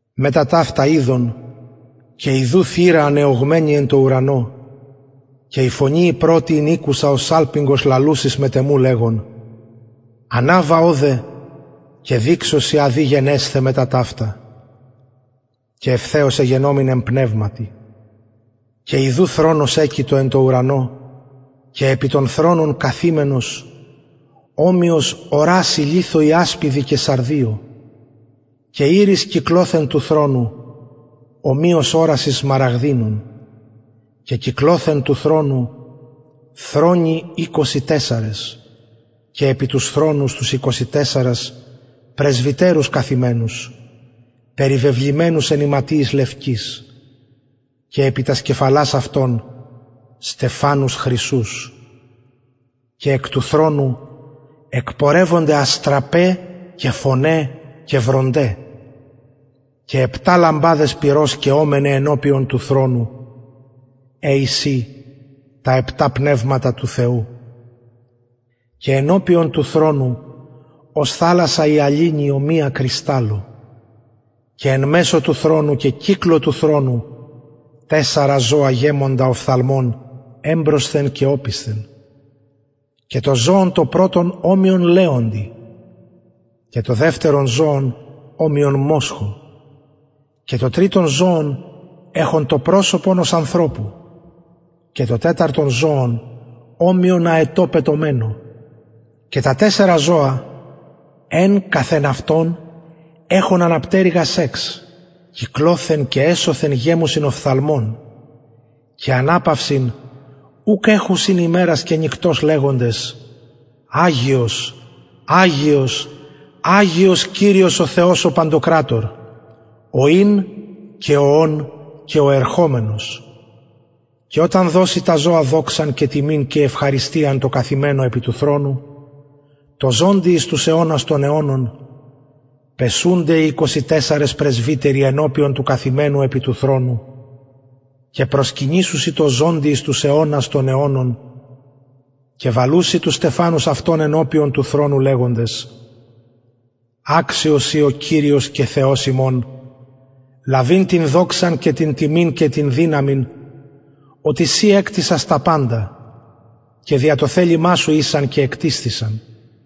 μετα ταυτα ειδον και ιδου θυρα ανεωγμενη εν τω ουρανω και η φωνη η πρωτη ην ηκουσα ως σαλπιγγος λαλουσης μετ εμου λεγων αναβα ωδε και δειξω σοι α δει γενεσθαι μετα ταυτα και ευθεως εγενομην εν πνευματι και ιδου θρονος εκειτο εν τω ουρανω και επι τον θρονον καθημενος ομοιος ορασει λιθω ιασπιδι και σαρδιω και ιρις κυκλοθεν του θρονου ομοιως ορασις σμαραγδινων και κυκλοθεν του θρονου θρονοι εικοσι τεσσαρες και επι τους θρονους τους εικοσι τεσσαρας πρεσβυτερους καθημενους περιβεβλημενους εν ιματιοις λευκοις και επι τας κεφαλας αυτων στεφανους χρυσους και εκ του θρονου εκπορευονται αστραπαι και φωναι και βρονται και επτα λαμπαδες πυρος καιομεναι ενωπιον του θρονου αυτου αι εισιν επτα πνευματα του θεου και ενωπιον του θρονου ως θαλασσα υαλινη ομοια κρυσταλλω και εν μεσω του θρονου και κυκλω του θρονου τεσσαρα ζωα γεμοντα οφθαλμων εμπροσθεν και οπισθεν και το ζωον το πρωτον ομοιον λεοντι και το δευτερον ζωον ομοιον μοσχω και το τριτον ζωον εχον προσωπον ανθρωπου και το τεταρτον ζωον ομοιον αετω πετομενω και τα τεσσαρα ζωα εν καθ εν εχον ανα πτερυγας εξ κυκλοθεν και εσωθεν γεμουσιν οφθαλμων και αναπαυσιν ουκ εχουσιν ημερας και νυκτος λεγοντες αγιος αγιος αγιος κυριος ο θεος ο παντοκρατωρ ο ην και ο ων και ο ερχομενος και οταν δωσιν τα ζωα δοξαν και τιμην και ευχαριστιαν τω καθημενω επι του θρονου τω ζωντι εις τους αιωνας των αιωνων πεσουνται οι εικοσι τεσσαρες πρεσβυτεροι ενωπιον του καθημενου επι του θρονου και προσκυνησουσιν τω ζωντι εις τους αιωνας των αιωνων και βαλουσιν τους στεφανους αυτων ενωπιον του θρονου λεγοντες αξιος ει ο κυριος και ο θεος ημων ο αγιος λαβειν την δοξαν και την τιμην και την δυναμιν οτι συ εκτισας παντα και δια το θελημα σου ησαν και εκτισθησαν